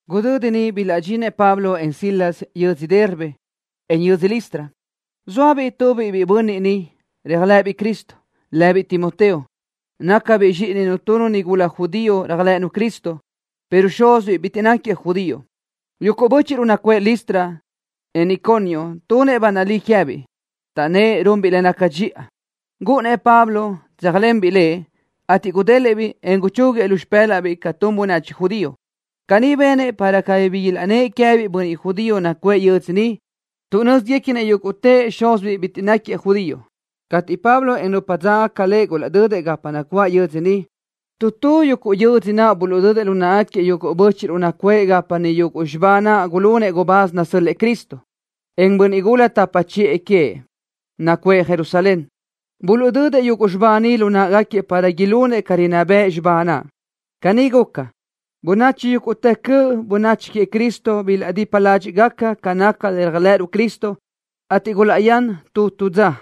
Gudödi niʼ bilaʼdxinëʼ Pablo, en Silas yödzö Derbe, en yödzö Listra. Zóabiʼ tu biʼi bönniʼ niʼ, réajlëʼëbiʼ Cristo, lëbiʼ Timoteo. Nácabiʼ zxíʼininu tu nigula judío réajlëʼënu Cristo, pero xúzibiʼ bitiʼ náquiëʼ judío. Yuguʼ bö́chiʼruʼ nacuʼë Listra, en Iconio tunëʼ ba nalí queë́biʼ, taʼnnë́ʼ runbiʼ le naca dxiʼa. Gúʼunnëʼ Pablo tséajlenbiʼ biʼi ni lëʼ, ateʼ gudélëʼë-biʼ, en guchúguiëʼ lu xipë́laʼbiʼ ca tun bönachi judío. Caní benëʼ para cabí ilaʼnnë́ʼ queë́biʼ bönniʼ judío nacuʼë yuguʼ yödzö niʼ, tuʼ nö́ziguequinëʼ yúguʼtëʼ xúzibiʼ bitiʼ náquiëʼ judío. Cateʼ Pablo, en nupa dzágagaca lëʼ gulaʼdödëʼ gapa nacuáʼ yödzö niʼ, tu tu yödzö naʼ buluʼdödëʼ lu náʼagaquiëʼ yuguʼ bö́chiʼruʼ nacuʼë gapa niʼ yuguʼ xibá naʼ gulunëʼ gubáz nasö́l-lëʼë Cristo, en bönniʼ gula tapa chiʼë bönachi queëʼ, nacuʼë Jerusalén. Buluʼdödëʼ yuguʼ xibá ni lu náʼagaquiëʼ para ilunëʼ ca rinná bëʼ xibá naʼ. Caní guca, bönachi yúguʼtë cöʼ bönachi queëʼ Cristo bilaʼdipa ládxiʼgaca ca naca le réajlëʼëruʼ Cristo, ateʼ gulaʼyán tu tu dza.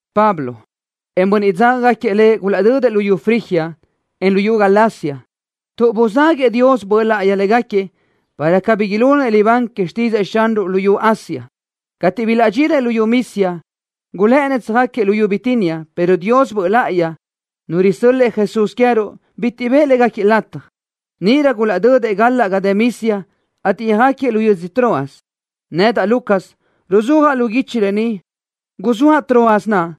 Pablo, en bönniʼ dzágagaquiëʼ lëʼ gulaʼdödëʼ luyú Frigia, en luyú Galacia, tuʼ buzáguëʼë Dios Böʼ Láʼayi xinö́zgaquiëʼ, para cabí ilunëʼ libán que xtídzëʼë Xanruʼ luyú Asia. Cateʼ bilaʼdxinëʼ luyú Misia, gulë́ʼënnëʼ tsöjáquiëʼ luyú Bitinia, pero Dios Böʼ Láʼayi, Nu risö́l-lëʼë Jesús queë́ruʼ, bitiʼ bëʼë légaquiëʼ lataj. Níʼirö gulaʼdödëʼ galaʼ ga dë Misia, ateʼ yöjáquiëʼ lu yödzö Troas. Nedaʼ Lucas, ruzúajaʼ lu guichi lë ni, guzóaʼ Troas naʼ,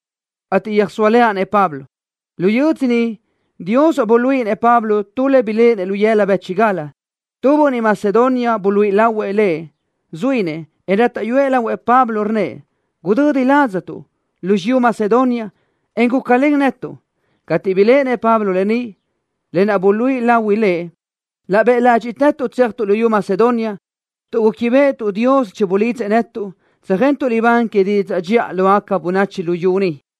ateʼ yöjsóalenaʼ-nëʼ Pablo. Lu yödzö niʼ Dios buluíʼinëʼ Pablo tu le biléʼenëʼ lu yëla bë́chigal. Tu bönniʼ Macedonia buluíʼi lahuëʼ lëʼ, zuínëʼ, en rátaʼyuëʼ lahuëʼ Pablo, rnnëʼ: “Gudödi ladztuʼ, lu xiyú Macedonia, en gúcalen netuʼ.” Cateʼ biléʼenëʼ Pablo lë ni, lë naʼ buluíʼi lahui lëʼ, laʼ bëʼ ládxiʼtëtuʼ tséajtuʼ luyú Macedonia, tuʼ gúquibeʼetuʼ Dios chibulidzëʼ netuʼ tsöjentuʼ libán que didzaʼ dxiʼa lógaca bönachi luyú niʼ.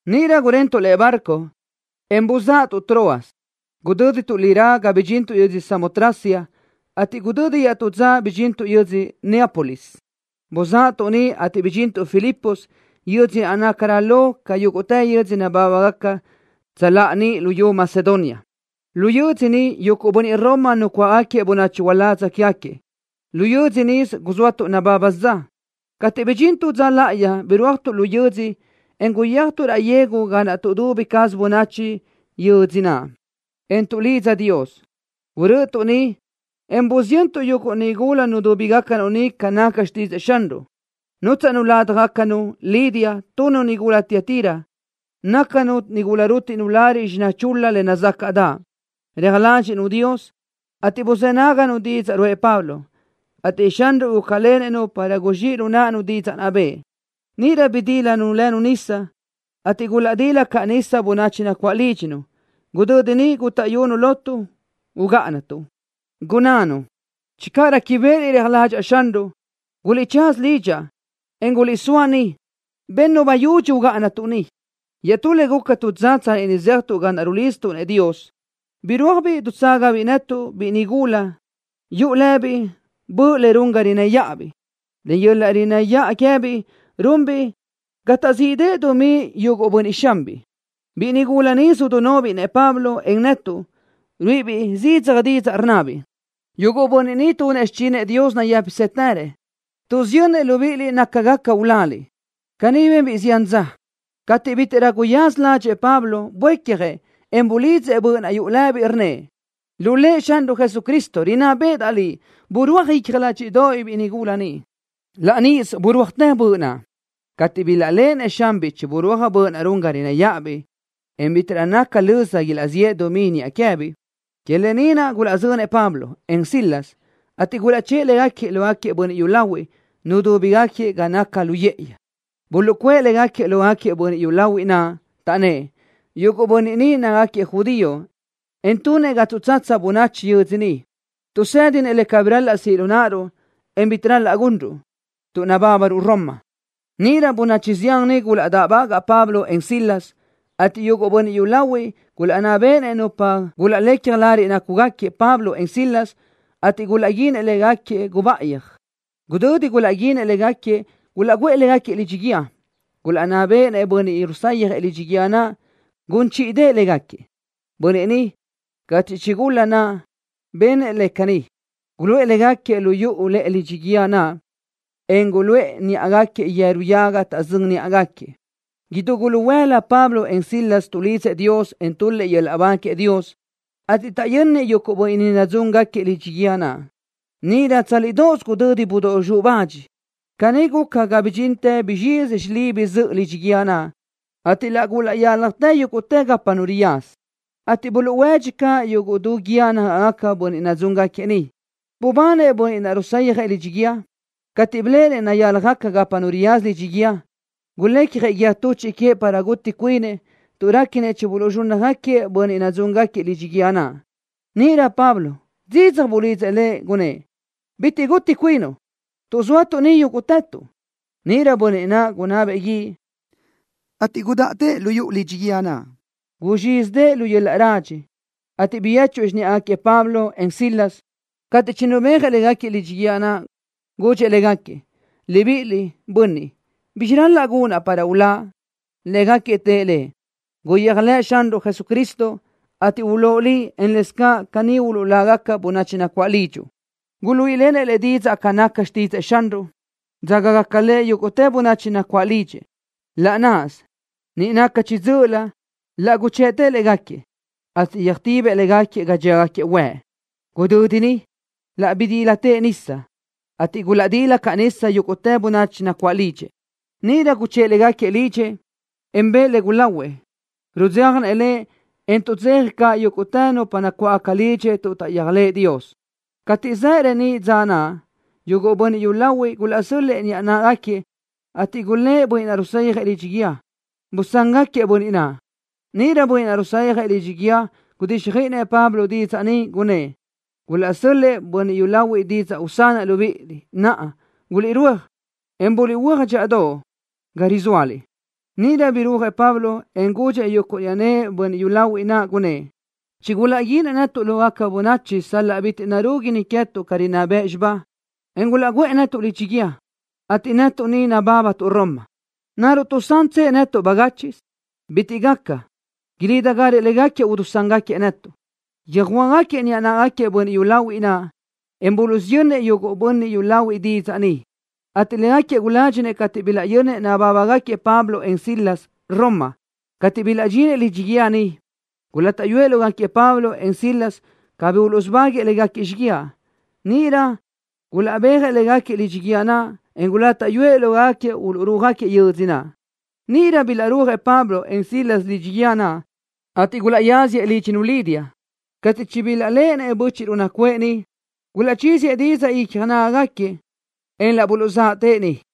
Níʼirö gurentuʼ lëʼe barco, en buzáʼatuʼ Troas. Gudö́dituʼ lirá ga bidxintuʼ yödzö Samotracia, ateʼ gudödi iaʼtú dza bidxintuʼ yödzö Neápolis. Buzáʼatuʼ niʼ, ateʼ bidxintuʼ Filipos, yödzö naʼ nácarö lo ca yúguʼtë yödzö nabábagaca tsöláʼa niʼ luyú Macedonia. Lu yödzö niʼ yuguʼ bönniʼ Roma nucuáʼagaquiëʼ bönachi uládz quégaquiëʼ. Lu yödzö nisö guzóatuʼ nababa dza. Cateʼ bidxín tu dza láʼayi, birúajtuʼ lu yödzö, en guyéajtuʼ raʼ yegu ga naʼ tuʼdubi caz bönachi yödzö naʼ, en tuʼlidza Dios. Gurö́ʼötuʼ niʼ, en busiyöntuʼ yuguʼ nigula nudúbigacanu niʼ ca naca xtídzëʼë Xanruʼ. Nútsaʼnu ládjagacanu Lidia, tu nigula Tiatira. Nácanu nigula rútiʼnu lariʼ xiná chul-la le nazácaʼdaʼ. Reaj ládxiʼnu Dios, ateʼ buzë́ náganu didzaʼ ruʼë Pablo, ateʼ Xanruʼ gúcalenëʼ-nu para guzxíʼ lu náʼanu didzaʼ naʼ bëʼë. Níʼirö bidílanu lënu nisa, ateʼ gulaʼdila caʼ nisa bönachi nacuáʼ lídxinu. Gudödi niʼ gútaʼyunu lotuʼ, gunnánu: —Channö réquibeʼeliʼ réajlëʼa Xanruʼ, guliʼtsaza lidxaʼ, en guliʼsóa niʼ. Bennu bayudxi ugáʼanatuʼ niʼ. Iaʼtú le guca tu dza tsanni niʼ zéajtuʼ ga naʼ rulidztuʼ-nëʼ Dios, birúajbiʼ dutságabiʼ tu biʼi nigula netuʼ yuʼu lëbiʼ böʼ le run ga rinnë́ yáʼabiʼ. Len yöl-laʼ rinnë́ yaʼa queë́biʼ runbiʼ ga taʼzíʼdëʼë dumí yuguʼ bönniʼ xanbiʼ. Biʼi nigula ni sudunóbiʼ-nëʼ Pablo, en netuʼ, ruíʼibiʼ zidzaj didzaʼ, rnnabiʼ: —¡Yuguʼ bönniʼ ni tunëʼ xichinëʼ Dios nayë́pisëtërëʼ! ¡Tuʼsiyönnëʼ libíʼiliʼ naca gaca uláliʼ! Caní benbiʼ zián dza. Cateʼ bítiʼrö guyaza ládxëʼë Pablo, buécjëʼ, en bulidzëʼ böʼ naʼ yuʼu lëbiʼ, rnnëʼ: —Lu Lëʼ Xanruʼ Jesucristo, rinná béʼedaʼ liʼ. ¡Burúaj icja ládxiʼdoʼobiʼ biʼi nigula ni! Laʼ níʼisö burúajtë böʼ naʼ. Cateʼ bilaʼléʼenëʼ xanbiʼ chiburúaj böʼ naʼ run ga rinnë́ yáʼabiʼ, en bítiʼrö naca löza ilaʼziʼë dumí niʼa queë́biʼ, que lë ni naʼ gulaʼzönëʼ Pablo, en Silas, ateʼ gulaʼchë́ʼë légaquiëʼ lógaquiëʼ bönniʼ yúlahuiʼ, nudúbigaquiëʼ ga naca lu yë́ʼëyi. Buluʼcuʼë légaquiëʼ lógaquiëʼ bönniʼ yúlahuiʼ naʼ, taʼnnë́ʼ: —Yuguʼ bönniʼ ni nácagaquiëʼ judío, en tunëʼ ga tuʼtsatsa bönachi yödzö ni. Tuʼsë́dinëʼ le cabí ral-laʼ siʼ lu náʼaruʼ, en bitiʼ ral-laʼ gunruʼ, tuʼ nabábaruʼ Roma. Níʼirö bönachi zián niʼ gulaʼdáʼbagaʼ Pablo, en Silas, ateʼ yuguʼ bönniʼ yúlahuiʼ gulaʼnná béʼenëʼ nupa gulaʼlecja lariʼ nácugaquiëʼ Pablo, en Silas, ateʼ gulaʼguínëʼ légaquiëʼ gubáʼayi. Gudödi gulaʼguíndëʼë légaquiëʼ, gulaʼguʼë légaquiëʼ lidxi guíë. Gulaʼnná béʼenëʼ bönniʼ rusayjëʼ lidxi guíë naʼ gun chíʼidëʼë légaquiëʼ. Bönniʼ ni, cateʼ chigulaʼnná béʼenëʼ lëʼ caní, guluʼë légaquiëʼ lu yuʼu lëʼe dxiʼ lidxi guíë naʼ, en guluʼë níʼagaquiëʼ yeru yaga taʼzö́n níʼagaquiëʼ. Idú guluhuëla Pablo, en Silas tuʼlidzëʼ Dios, en tul-lëʼ yöl-laʼ ba queëʼ Dios, ateʼ taʼyönnëʼ yuguʼ bönniʼ nadzúngaquiëʼ lidxi guíë naʼ. Níʼirö tsálidoʼos gudödi budóʼ zxuʼ bach. Caní guca ga bidxintë guzxizi xilibi zöʼö lidxi guíë naʼ, ateʼ laʼ gulaʼyáljatë yúguʼtë gapa nu riyaza, ateʼ buluʼhuédxi caʼ yuguʼ du guíë nágaʼgaca bönniʼ nadzúngaquiëʼ niʼ. Bubanëʼ bönniʼ naʼ rusayjëʼ lidxi guíë. Cateʼ biléʼenëʼ nayáljagaca gapa nu riyaza lidxi guíë naʼ, gulecjëʼ guíë tuchiʼ queëʼ para guti cuinëʼ, tuʼ réquinëʼ chibuluʼzxúnnajëʼ bönniʼ nadzúngaquiëʼ lidxi guíë naʼ. Níʼirö Pablo zidzaj bulidzëʼ lëʼ, gunnë́ʼ: —¡Bitiʼ bi gúni cuinuʼ, tuʼ zóatuʼ ni yúguʼtëtuʼ! Níʼirö bönniʼ naʼ gunabëʼ guíʼ, ateʼ gudáʼatëʼ lu yuʼu lidxi guíë naʼ. Guzxízidëʼë lu yöl-laʼ radxi, ateʼ biyéchuëʼ xiníʼagaquiëʼ Pablo, en Silas. Cateʼ chinubéajëʼ légaquiëʼ lidxi guíë naʼ, gudxëʼ légaquiëʼ: —Libiʼiliʼ, bönniʼ, ¿bizxi ral-laʼ gunaʼ para uláʼ? Légaquiëʼ tëʼ lëʼ: —Guyéajlëʼë Xanruʼ Jesucristo, ateʼ ulóʼ liʼ, en lëscaʼ caní uluʼlágaca bönachi nacuáʼ lidxuʼ. Guluíʼilenëʼ lëʼ didzaʼ ca naca xtídzëʼë Xanruʼ, dzágagaca lëʼ yúguʼtë bönachi nacuáʼ lidxëʼ. Laʼ náʼasö, niʼ naca chiʼi dzö́ʼölö laʼ guchëʼtëʼ légaquiëʼ, ateʼ yöjtibëʼ légaquiëʼ ga dxíagaquiëʼ huëʼ. Gudödi niʼ, laʼ bidílatëʼ nisa, ateʼ gulaʼdila caʼ nisa yúguʼtë bönachi nacuáʼ lidxëʼ. Níʼirö guchë́ʼë légaquiëʼ lidxëʼ, en bëʼë le gulahuëʼ. Rudzéjanëʼ lëʼ, en tuʼdzeja caʼ yúguʼtë bönachi nacuáʼ lidxëʼ tuʼ taʼyéajlëʼë Dios. Cateʼ zaʼ reníʼ dza naʼ, yuguʼ bönniʼ yúlahuiʼ gulaʼsö́l-lëʼë niʼa náʼagaquiëʼ, ateʼ gulë́ʼ bönniʼ naʼ rusayjëʼ lidxi guíë: —Busán-gáquiëʼ bönniʼ naʼ. Níʼirö bönniʼ naʼ rusayjëʼ lidxi guíë gudíxjöiʼinëʼ Pablo didzaʼ ni, gunnë́ʼ: —Gulaʼsö́l-lëʼë bönniʼ yúlahuiʼ didzaʼ usanaʼ libíʼiliʼ. Naʼa, guliʼrúaj, en buliʼhuö́aj dxíʼadoʼ ga rizóaliʼ. Níʼirö birúajëʼ Pablo, en gudxëʼ yuguʼ niʼa náʼagaquiëʼ bönniʼ yúlahuiʼ naʼ, gunnë́ʼ: —Chigulaʼguínëʼ netuʼ lógaca bönachi sal-laʼ bitiʼ narúguini queë́tuʼ ca rinná bëʼ xibá, en gulaʼguʼë netuʼ lidxi guíë, ateʼ netuʼ ni nabábatuʼ Roma. ¿Naruʼ tuʼsantsëʼ netuʼ bagáchiʼsö? ¡Bitiʼ caʼ gaca! ¡Ilídigarëʼ légaquiëʼ udusángaquiëʼ netuʼ! Yöjhuö́jgaquiëʼ niʼa náʼagaquiëʼ bönniʼ yúlahuiʼ naʼ, en buluʼsiyönnëʼ yuguʼ bönniʼ yúlahuiʼ didzaʼ ni, ateʼ légaquiëʼ guládxinëʼ cateʼ bilaʼyönnëʼ nabábagaquiëʼ Pablo, en Silas Roma. Cateʼ bilaʼdxinëʼ lidxi guíë niʼ, gulátaʼyuëʼ lógaquiëʼ Pablo, en Silas cabí uluʼsubáguëʼë légaquiëʼ xíguiaʼ. Níʼirö gulaʼbéajëʼ légaquiëʼ lidxi guíë naʼ, en gulátaʼyuëʼ lógaquiëʼ uluʼrúajëʼ yödzö naʼ. Níʼirö bilaʼrúajëʼ Pablo, en Silas lidxi guíë naʼ, ateʼ gulaʼyáziëʼ lídxinu Lidia. Cateʼ chibilaʼléʼenëʼ bö́chiʼruʼ nacuʼë niʼ, buluʼchíziëʼ didzaʼ icja nágagaquiëʼ, en laʼ buluʼzáʼatëʼ niʼ.